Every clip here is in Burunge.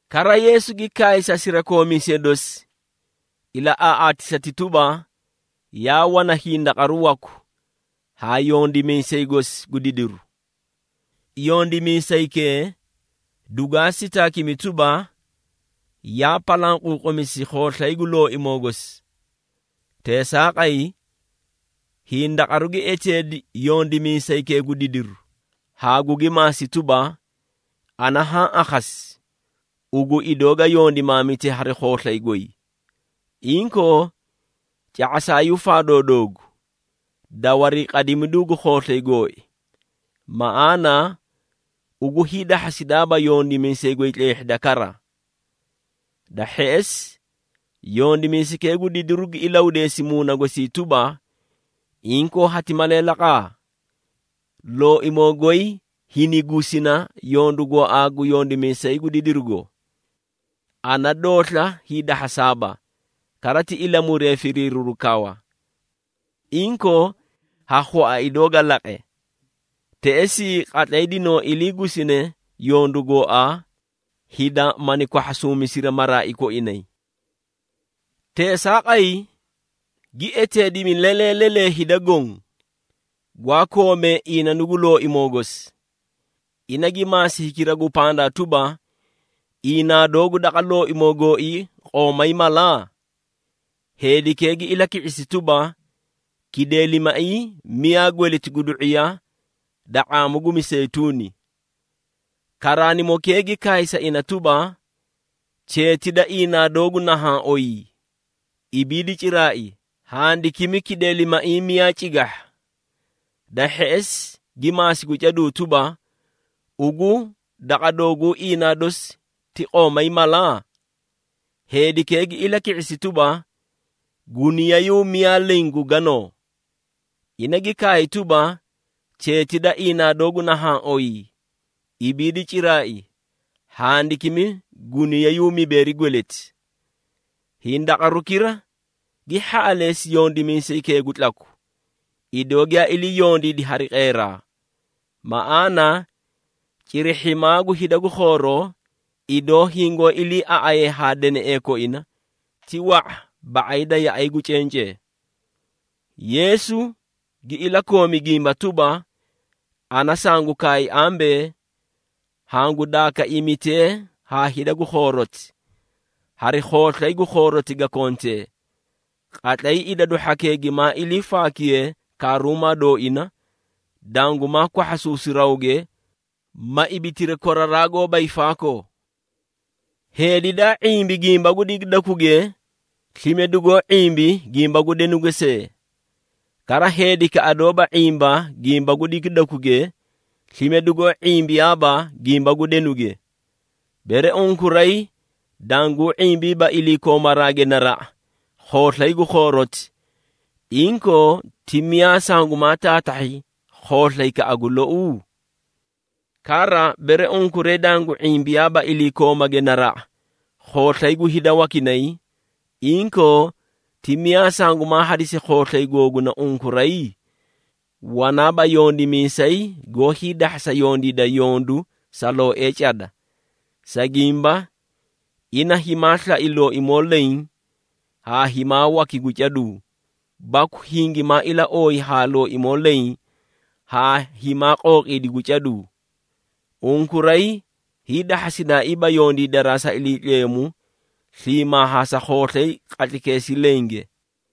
Kara, Yeesu gi kaay sa sirakoomiisee dosi, ilaꞌaaꞌaatisati tuba, “Yaa wana hindaqaru waku haa yondimiisay gosi gu didiru. Yondimiisaykee, dugwaa sitaakimi tuba, yaa palanquuqumisi khooslay gu looimoo gosi. Teesaaqay, hindaqaru gi eteedi yondimiisaykee gu didiru haa gugi maasi tuba, ‘Ana haã akhasi ugu idoo ga yondimaamite hari khooslay goy! Inkoo, ca⁄asaayuu faadoo doogu, da wariiqadimiduu gu khooslay gooii. Maꞌaana, ugu hiidahhasidaaba yondimiisay goy tleehhida kara.’ Da hheꞌesi, yondimiisaykee gu didiru gi ilahudeesi muuna gosii tuba, ‘Inkoo hati malee laqa? Looimoo goy hinigusina yondu gooaa gu yondimiisay gu didirugo. Ana doosla hiidahhasaaba, kara ti ilamuree firiiriru kawa. Inkoo, ha khua idoo ga laqe! Teꞌesii qatlay dinoo iliigusine yondu gooaa, hida mani kwahhasuumisiri maraai koinay.’ Teesaaqay, gi eteedimi lelee lelee hida goõ, gwaa koomee iinanu gu looimoo gosi. Ina gi maasi hikira gu pandaa tuba, ‘Iinaa doogu daqa looimoo gooii qoomay mala?’ Heedikee gi ilaki⁄isi tuba, ‘Kideelimaiĩ miyaa gweleti gu du⁄iya da ⁄aamu gu miseyituuni.’ Karaanimokee gi kaay sa ina tuba, ‘Cheeti da iinaa doogu nahaã oyii, ibiidi ciraai, handakimi kideelimaiĩ miyaa cigahha.’ Da hheꞌesi gi maasi gu caduu tuba, ‘Ugu daqa dooguu iinaa dosi ti qoomay mala?’ Heedikee gi ilaki⁄isi tuba, ‘Guniyayuu miyaa leẽ gu ganoo.’ Ina gi kaay tuba, ‘Cheeti da iinaa doogu nahaã oyii, ibiidi ciraai, handakimi guniyayuu mibeeri gweleti!’ Hindaqarukira gi hhaꞌaleesi yondimiisaykee gu tlaku, idoo giyaa ilii yondiidi hari qeeraa. Maꞌaana, cirihhimaa gu hida gu khooroo, idoo hingoó iliiaꞌayee haa deneꞌee koina, ti wa⁄a ba⁄ay da yaꞌay gu cencee.” Yeesu gi ilakoomi gimba tuba, “Ana sangu kaay ambee, hangu daakaiimitee haa hida gu khooroti, hari khooslay gu khooroti ga kontee. Qatlay idadu hhakee gimaa ilii faakiyee karuumaa dooina, dangumaa kwahhasuusi rawge ma ibitiri koraraa goóba hiifaakoo. Heedi daa ⁄imbi gimba gu digidakuge, slime dugoó ⁄imbi gimba gu denuge see. Kara, heedikaꞌa doóba ⁄imba gimba gu digidakuge, slime dugoó ⁄imbiyaaba gimba gu denuge. Bere unkuray danguu ⁄imbiiba iliikoomaraage naraꞌa, khooslay gu khooroti, inkoo, ti miyaa sangumaa taatahhi khooslaykaꞌa gu lou? Kara, bere unkuray dangu ⁄imbiyaaba iliikoomage naraꞌa, khooslay gu hida wakinay, inkoo, ti miyaa sangumaa hadisi khooslay googuna unkuray? Wanaaba yondimiisay goó hiidahhasa yondiida yondu sa looee cada. Sa gimba, ina himaa slai looimoo leẽ haa himaa waki gu caduu, baku hingimaa ilaooyi haa looimoo leẽ haa himaa qooqiidi gu caduu. Unkuray hiidahhasidaaiiba yondiidaraa sa Iliitleemu sliimaa haa sa khooslay qatlaykeesii lenge.”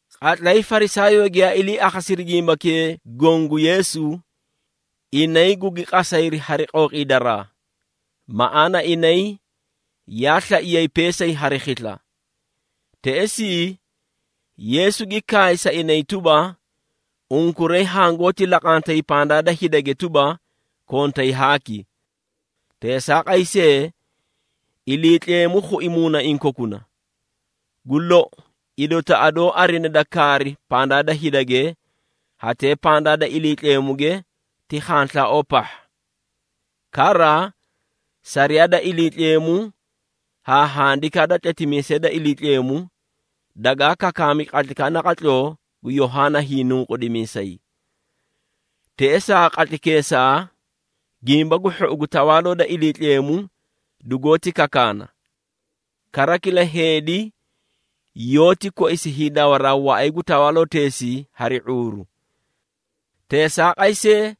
Qatlay Farisaayoo giyaa ilii akhasiri gimbakee goõ gu Yeesu, inay gugi qasayri hari qooqiidaraa, maꞌaana inay yaa slaiyay peesay hari khisla. Teꞌesii, Yeesu gi kaay sa inay tuba, “Unkuray hangoóti laqantay pandaa da hidage tuba, kontay haaki. Teesaaqay see, Iliitleemu khui muunaiĩ kokuna. Gu lou idotaꞌa doó arinee da kaari pandaa da hidage, hatee pandaa da Iliitleemuge ti khanslaaoo pahha. Kara, sariyaa da Iliitleemu haa handikaa da tletimiisee da Iliitleemu, dagaa kakaami qatlaykaꞌa naqatloo gu Yohaana Hiinunqudimiisay. Teꞌesaa qatlaykeesaa, Gimba gu Hhou gu Tawaaloo da Iliitleemu dugoóti kakaana. Kara kila heedi yoóti koisi hiidawaraa waꞌay gu tawaaloteesii hari ⁄uuru. Teesaaqay see,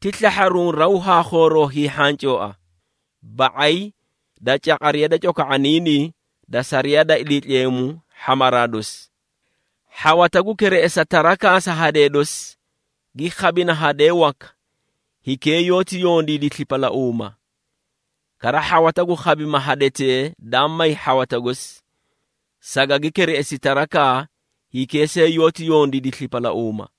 ti slahharuũ raw haa khooroo hiihhancooa, ba⁄ay da caqariya da coko⁄oniinii da sariyaa da Iliitleemu hhamaraa dosi. Hhawata gu kereꞌesa tarakaa sa hadee dosi, gi khabina hadee waka, hikee yoóti yondiidi slipalauuma. Kara hhawata gu khabima hadetee daa may ha hhawata gosi, sagagi kereꞌesi tarakaa, hikee see yoóti yondiidi slipalauuma.”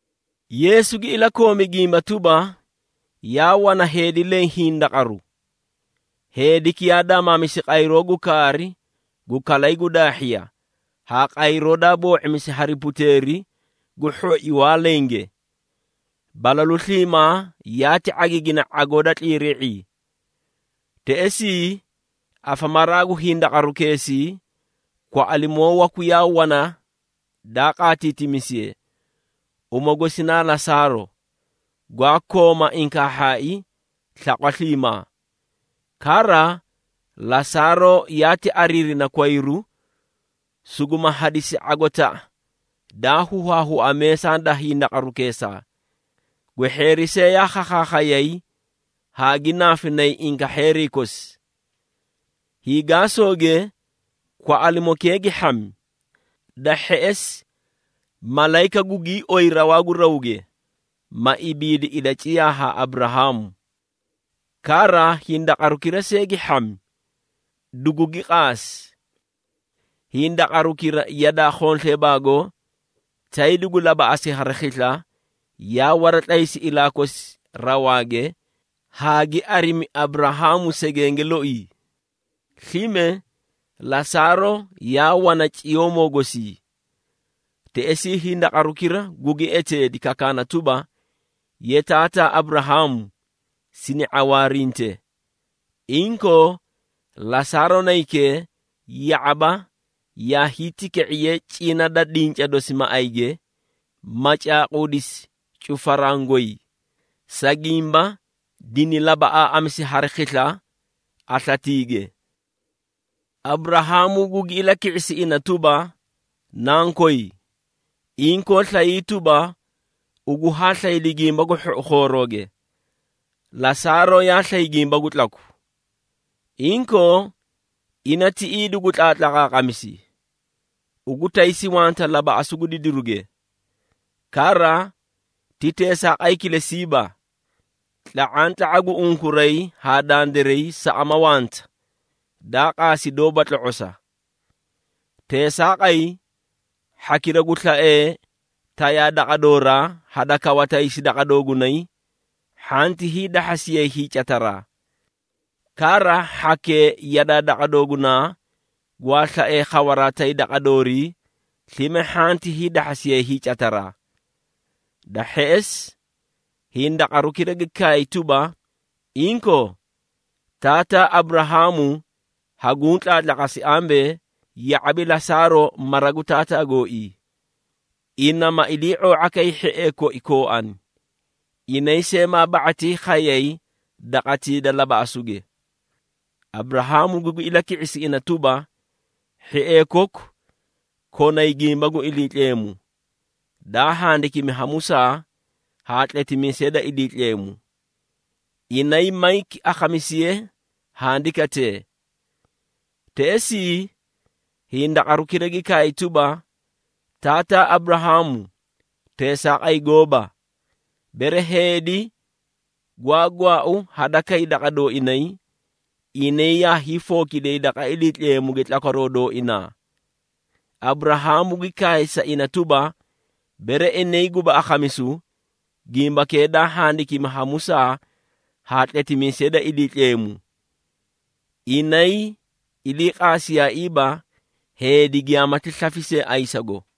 Yeesu gi ilakoomi gimba tuba, “Yaa wana heedi leẽ hindaqaru. Heediki yaa daamaamisi qayroo gu kaari gu kalay gu daahhiya haa qayroo daa boo⁄imisi hari puteeri gu hhoi waa lenge. Balalu sliimaa yaati ⁄agiigina ⁄agoo da tliirii⁄ii. Teꞌesii, afamaraa gu hindaqarukeesii, kwaꞌalimoo waku yaa wana daa qaatiitimisiye, uma gosi naa Lasaaro, gwaa kooma inkaahhaai slaqwa sliimaa. Kara, Lasaaro yaati ariirina kwayru, suguma hadisi ⁄agotaꞌa daa huhaahua meesaa da hindaqarukeesaa. Gwehheeri see yaa khakhaakhayay, haa gi naafinay inkahheerii kosi. Hiigaasooge, kwaꞌalimokee gi hhami, da hheꞌesi malayika gugii oyiri rawaa gu rawge, ma ibiidi ilaciyaa haa Aburahaamu. Kara hindaqarukira see gi hhami, dugugi qaasi. Hindaqarukira yadaa khonsleebaago, tay dugu labaꞌasi hari khisla, yaa waratlaysi ilaa kosi rawaage haa gi arimi Aburahaamu segenge loii. Slime Lasaaro, yaa wana ciyoomoo gosii. Teꞌesii, hindaqarukira gugi eteedi, kakaana tuba, ‘Ye Taataa Aburahaamu, sini ⁄awaarinte. Inkoo, Lasaaro naykee, ya⁄aba yaa hiitika⁄iye cina da dinca dosi maꞌayge, ma caaquudisi cufaraã goy, sa gimba dini labaꞌaaꞌamisi hari khisla aslaatiige.’ Aburahaamu gugi ilaki⁄isi ina tuba, ‘Nankoy, inkoo slayii tuba, ugu haa slaydi gimba gu hhou khoorooge, Lasaaro yaa slay gimba gu tlaku. Inkoo ina tiꞌii dugu tlaatlaqaaqamisi, ugu taysi wanta labaꞌasu gu didiruge. Kara, ti teesaaqay kilesiiba, tla⁄antla⁄a gu unkuray haa dandiray saꞌama wanta daa qaasi, dooba tlo⁄osa. Teesaaqay, hhakira gu slaee tayaa daqa dooraa, hadakawa taysi daqa doogunay, hhanti hiidahhasiyay hiicataraa. Kara, hhakee yadaa daqa doogunaa, gwaa slaee khawaraa tay daqa doorii, slime hhanti hiidahhasiyay hiicataraa.’ Da hheꞌesi, hindaqarukira gi kaay tuba, ‘Inkoo, taataa Aburahaamu haguũ tlaatlaqasi ambee, ya⁄abi Lasaaro mara gu taataa gooii. Ina, ma ilii⁄oo⁄a kay hhiee koi kooani, inay see maa ba⁄atii khayay daqatii da labaꞌasuge.’ Aburahaamu gugi ilaki⁄isi ina tuba, ‘Hhiee koku, konay gimba gu Iliitleemu, daa handikimi ha Musaa, haa tletimiisee da Iliitleemu. Inay mayki akhamisiyee handikatee.’ Teꞌesii, hindaqarukira gi kaay tuba, ‘Taataa Aburahaamu, teesaaqay gooba! Bere heedi gwaa gwaau hadakay daqa dooinay, inay yaa hiifookidiyay daqa Iliitleemuge tlakwaroo dooinaa.’ Aburahaamu gi kaay sa ina tuba, ‘Bere inay guba akhamisu, gimbakee daa handikimi ha Musaa haa tletimiisee da Iliitleemu, inay ilii qaasiyaaiiba, heedi giyaamati slafi see ayisago.’”